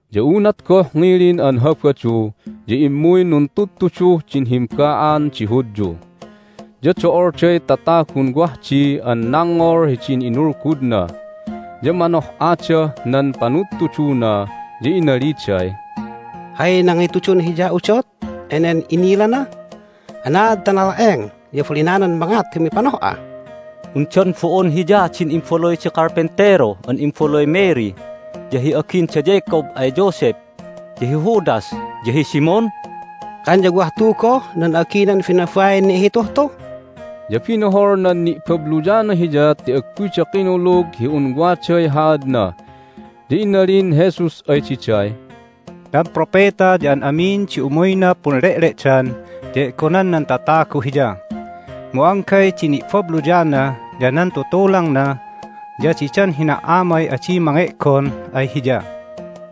Ya unat goh ngilin an Habadu ya immuy nuntudtuduh din himba'an di Hudyu. Ya do'olday tatagun wah di an nangngol hidin inulgudna, ya manoh'adah nan panudtuduna, ya inaliday, "Hay nangitudun Hiya udot enen inilana? Anaad ta nala'eng ya abalinanan mangat hi umipanoh'a? Undan bo'on Hiya din imbaluy di karpentero an imbaluy Mary, ya hi agin da Jacob ay Joseph, ya hi Judas, ya hi Simon? Kan ya wah tu goh nan a'aginan binabain ni'hituh tu!" Ya binohol nan ni'babluyana Hiya ti agguyda kinulug hi un waday haadna. Ya inalin Jesus ay diday, "Nan propeta ya an amin di umuyna punle'le'dan ya e'gonan nan tatagu hiya, mu anggay di ni'babluyana, ya nan tutulangna, ya didan hina"amay adi mange'gon ay hiya."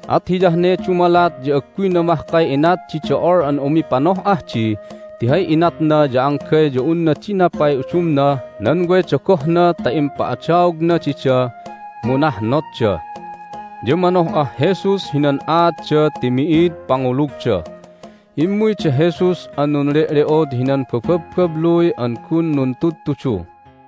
At hiyah ne dumalat ya agguyna mahkay inat di do'ol an umipanoh'ah di ti hay inatna ya anggay ya unna dinapay udumnah nan way dogohna ta impa'adaogna dida, mu nahnotda. Ya manoh'ah Jesus hinan aatda ti mi'id pangulugda. Immuy da Jesus an nunle'le'od hinan bababbabluy an gun nuntudtudu.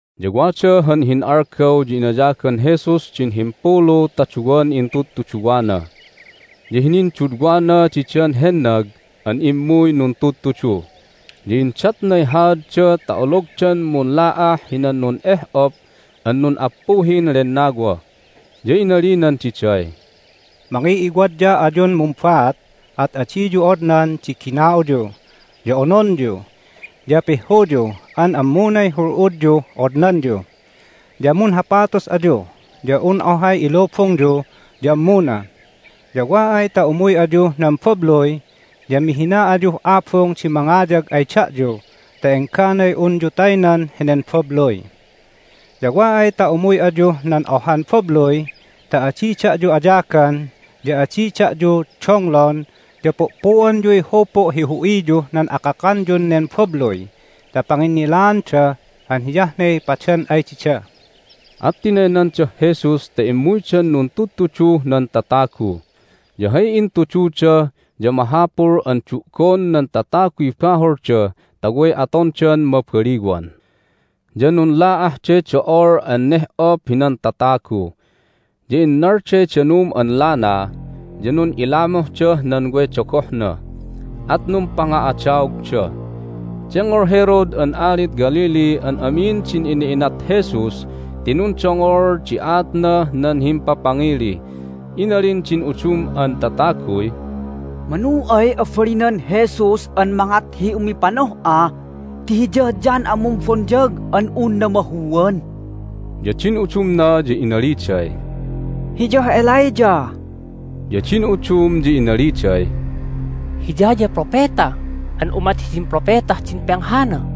Ya wada han hin'algaw ya inayagan Jesus din himpulu ta duwan intudtuduwana, ya hinindudwana didan hennag an immuy nuntudtudu, ya indatnay haadda ta ologdan munla'ah hinan nun'eh'op an nun'appuhin lennawa. Ya inalinan diday, "Mangiw'iwadya ayun mumbaat, at adiyu odnan di gina'uyu, ya ononyu, ya pihhuyu an ammunay hul'udyuh odnanyu. Ya munhapatus ayu, ya un ohay ilubungyu ya ammuna. Ya wa ay ta umuy ayuh nan babluy ya mihina ayuh abung di mangayag ay da'yu ta engganay unyu taynan henen babluy. Ya wa ay ta umuy ayuh nan ohan babluy ta adi da'yu ayagan ya adi da'yu donglon ya pu'pu'onyuy hupu' hi hu'iyuh nan akakanyun nen babluy ta panginnilaanda an hiyah ne padan ay dida." At tinaynandah Jesus ta immuydan nuntudtuduh nan tatagu, ya hay intududa ya mahapul an du'gon nan tataguy baholda ta way atondan mabaliwan. Ya nunla'ahday do'ol an neh'op hinan tatagu, ya innalday danum an lana, ya nun'ilamuhdah nan way dogohna, at numpanga'adaogda. Dengngol Herod an alid Galilee an amin din ina'inat Jesus ti nundongol di aatnah nan himpapangili. Inalin din udum an tataguy, "Manu ay abalinan Jesus an mangat hi umipanoh'a ti Hiyah John an Mumbonyag an un namahuan." Ya din udumna ya inaliday, "Hiyah Elijah." Ya din udum ya inaliday, "Hiya ya propeta an umat hidin propetah din penghana."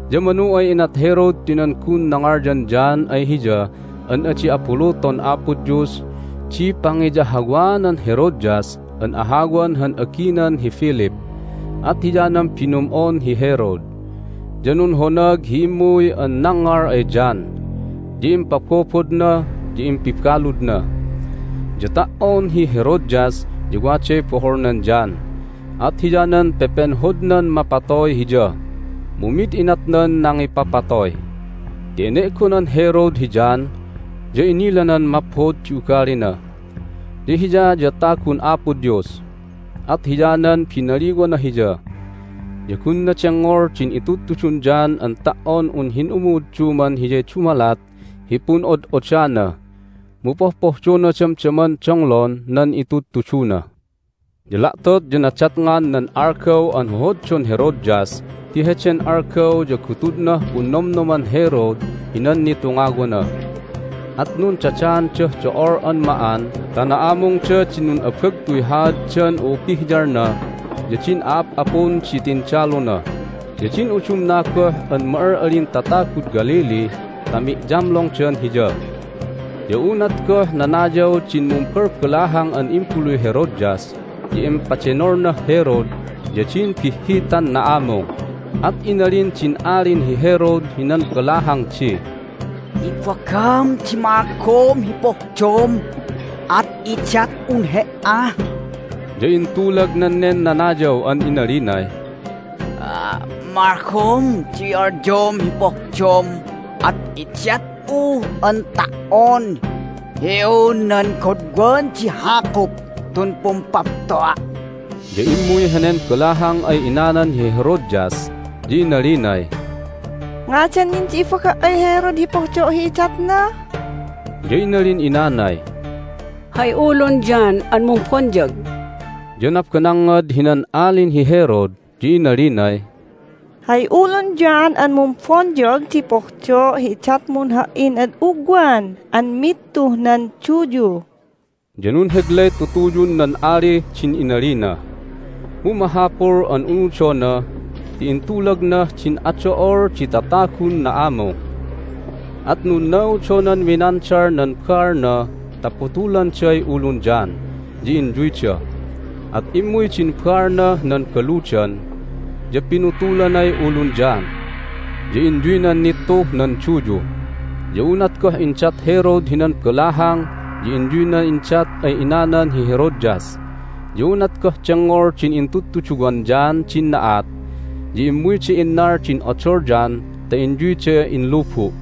Ya manu ay inat Herod ti nan gun nangalyan John ay hiya an adi abuluton Apo Dios di pangiyahawaanan Herodias an ahawan han aginan hi Philip! At hiyanan binum'on hi Herod, ya nunhonag hi immuy an nangngal ay John, ya impabobodna, ya impibaludna. Ya ta"on hi Herodias ya waday boholnan John, at hiyanan pepenhodnan mapatoy hiya. Mu mid inatnan nangipapatoy ti ene'gonan Herod hi John, ya inilanan maphod di ugalina, ya hiya ya tagun Apo Dios, at hiyanan binaliwana hiya. Ya gunna dengngol din itudtudun John an ta"on un hin'umu'udduman hiyay dumalat hi pun'od'oddana, mu pohpohdona damdaman donglon nan itudtuduna. Ya la'tot ya nadatngan nan algaw an hohoddon Herodias ti heden algaw ya gutudnah punnomnoman Herod hinan nitungawana, at nundadaandah do'ol an ma'an ta na'amungda din nun'abagtuy haaddan u'upihyalna, ya din a'ap'apun di tindaluna, ya din udumna goh an ma'al'alin tatagud Galilee ta mi'yamlongdan hiya. Ya unat goh nanayaw din mumbalbalahang an imbaluy Herodias ya impadenolnah Herod ya din bihhitan na'amung. At inalin din Alin hi Herod hinan balahang di, "Ibagam di malgom hi pohdom, at idat'un he"a." Ya intulagnan nen nanayaw an inalinay, "Malgom di alyom hi pohdom at idat'u an ta"on hi un nan godwan di hakup tun pumpapto'a'!" Ya immuy henen balahang ay inanan hi Herodias, ya inalinay, "Ngadan nin di ibaga' ay Herod hi pohdo' hi idatna?" Ya inalin inanay, "Hay ulun John an Mumbonyag!" Ya nabanangngad hinan Alin hi Herod, ya inalinay, "Hay ulun John an Mumbonyag di pohdo' hi idatmun ha"in ad ugwan an mittuh nan duyu." Ya nunheglay tutuyun nan alih din inalina, mu mahapul an unudona ti intulagnah din ado'ol di tatagun na'amung. At nunnaudonan minandal nan baalna ta putulanday ulun John ya inyuyda. At immuy din baalnah nan baludan, ya pinutulanay ulun John, ya inyuynan nittuh nan duyu. Ya unat goh indat Herod hinan balahang ya inyuyna indat ay inanan hi Herodias. Ya unat goh dengngol din intudtuduwan John din na'at ya immuyda innal din odol John ta inyuyda inlubu'.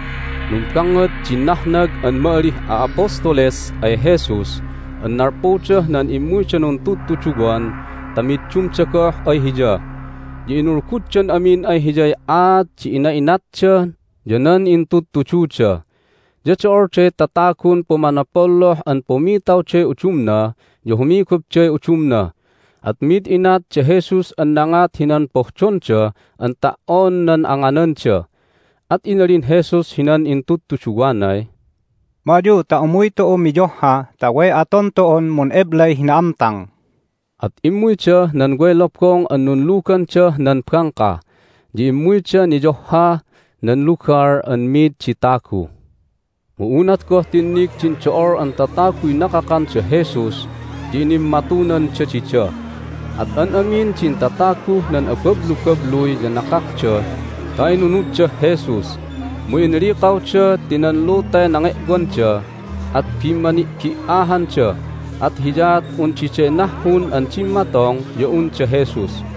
Numbangngad din nahnag an ma'alih a'apostoles ay Jesus an nalpudah nan immuyda nuntudtuduwan ta middumda goh ay Hiya, ya inulguddan amin ay Hiyay aat di ina'inatda ya nan intudtududa. Ya do'olday tatagun pumanopolloh an pumitawday udumna ya humigupday udumna, at mid inat da Jesus an nangat hinan pohdonda an ta"on nan angananda. At inalin Jesus hinan intudtuduwanay, "Ma ayu ta umuy tu'u miyohha ta way aton tu'un mun'eblay hi na'amtang." At immuydah nan way lobong an nunlugandah nan bangka, ya immuyda niyohhah nan lugal an mid di tagu. Mu unat goh tinnig din do'ol an tataguy nakakan da Jesus ya inimmatunanda dida, at an amin din tataguh nan abablubabluy ya nakakda ta inunuddah Jesus. Mu inlikawda ti nan lutay nange'wanda, at bimmani'bi"ahanda, at hiyaat un diday nahhun an dimmatong ya un da Jesus.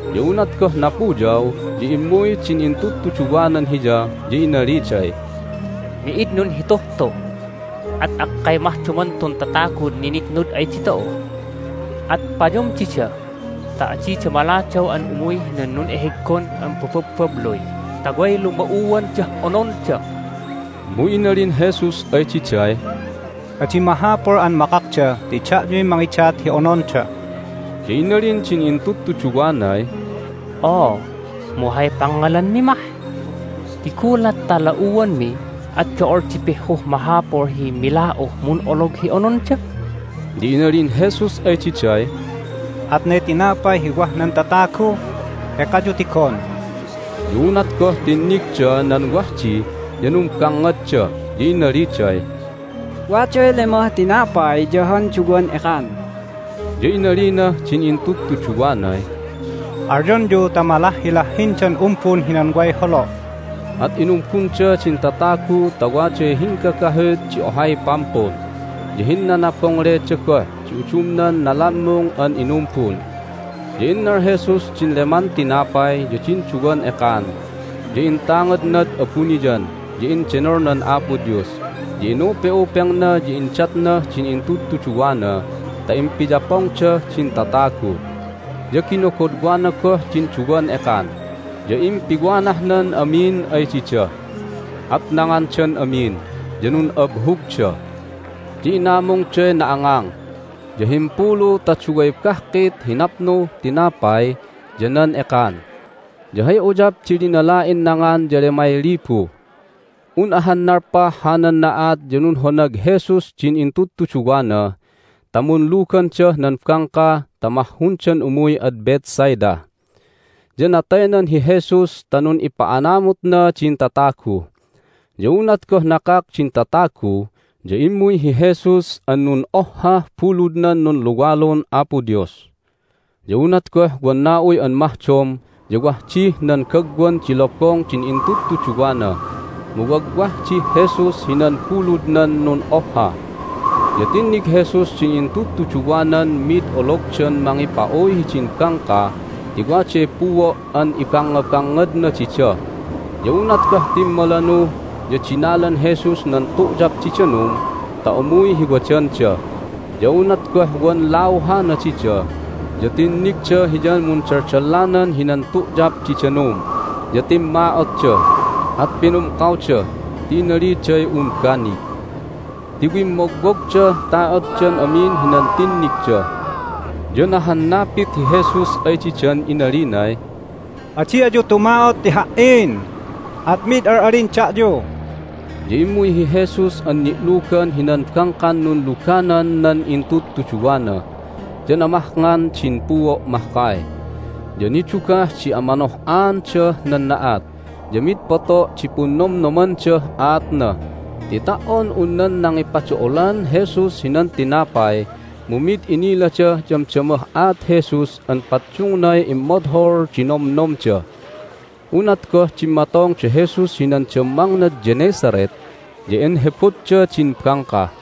Ya unat goh napuyaw ya immuy din intudtuduwanan Hiya, ya inaliday, "Mi'id nunhituh tu, at akkay mahdoman tun tatagun ninitnud ay ditu'u! At payom dida ta adida maladaw an umuy hinan nun'eheggon an bababbabluy ta way luma'uandah ononda." Mu inalin Jesus ay diday, "Adi mahapul an makakda ti da'yuy mangidat hi ononda." Ya inalin din intudtuduwanay, "Oo, mu hay pangngalanmi mah? Ti gulat ta la'uanmi at do'ol di pihhuh mahapul hi mila'uh mun'olog hi ononda!" Ya inalin Jesus ay diday, "Atnay tinapay hi wah nan tatagu? Ekayu tigon." Ya unat goh tinnigda nan wah di ya numbangngadda, ya inaliday, "Waday lemah tinapay ya han duwan ekan." Ya inalinah din intudtuduwanay, "Alyonyu ta malahhilahhindan umbun hinan way holo'." At inumbunda din tatagu ta waday hinggagahut di ohay pampun, ya hinnanabongleda goh di udumnan nalammung an inumbun. Ya innal Jesus din leman tinapay ya din duwan ekan, ya intangadnad abuniyan, ya endenolnan Apo Dios, ya inupe'upengna, ya indatnah din intudtuduwana ta impiyapongdah din tatagu. Ya ginogodwana goh din duwan ekan, ya impiwanahnan amin ay dida. At nangandan amin, ya nun'abhugda. Ya inamungday na'angang, ya himpulu ta duway bahkit hi napnuh tinapay ya nan ekan. Ya hay uyap di linala'in nangan ya lemay libu. Un ahan nalpah hanan na'at ya nunhonag Jesus din intudtuduwana ta munlugandah nan bangka ta mahhundan umuy ad Bethsaida. Ya nataynan hi Jesus ta nun'ipa'anamutna din tatagu. Ya unat goh nakak din tatagu ya immuy hi Jesus an nun'ohhah buludnan nunluwalun Apo Dios. Ya unat goh wan na'uy an mahdom ya wah dih nan gagwan di lobong din intudtuduwana, mu wagwah dih Jesus hinan buludnan nun'ohha. Ya tinnig Jesus din intudtuduwanan mid ologdan mangipa'uy hidin bangka ti waday puo' an ibangngabangngadna dida. Ya unat goh timmalanu ya dinalan Jesus nan tu'yap di danum ta umuy hi wadanda. Ya unat goh wan lauhana dida ya tinnigda Hiyan mundaldallanan hinan tu'yap di danum, ya timma'otda, at pinumkawda ti inaliday un banig ti wimmogwogdah ta'otdan amin hinan tinnigda. Ya nahannapit hi Jesus ay didan inalinay, "Adi ayu tuma'ot ti Ha"in, at mid al'alin da'yu!" Ya immuy hi Jesus an ni'lugan hinan bangkan nunluganan nan intudtuduwana, ya namahngan din puo' mahkay. Ya nidugah di amanoh'aandah nan na'at, ya mid poto' di punnomnomandah aatna ti ta"on un nan nangipado'olan Jesus hinan tinapay mu mid inilada damdamah aat Jesus an paddungnay immodhol di nomnomda. Unat goh dimmatong da Jesus hinan dammangnad Gennesaret ya inhebodda din bangka.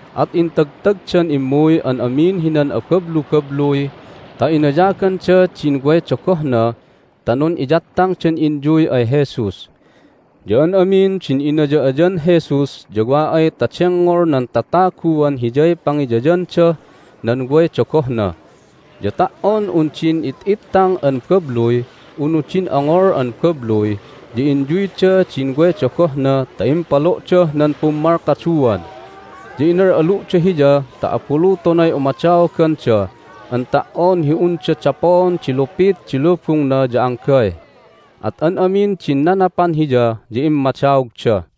At intagtagdan immuy an amin hinan abablubabluy ta inayaganda din way dogohna ta nun'iyattangdan inyuy ay Jesus. Ya an amin din inaya'ayan Jesus ya wa ay ta dengngol nan tataguan Hiyay pangiyayandah nan way dogohna. Ya ta"on un din it'ittang an babluy unu din ongol an babluy ya inyuyda din way dogohna ta impalo'dah nan pummalkaduan. Ya inal'alu'da Hiya ta abulutonay umadaoganda an ta"on hi unda dapoon di lupit di lubungna ya anggay. At an amin din nanapan Hiya ya immadaogda.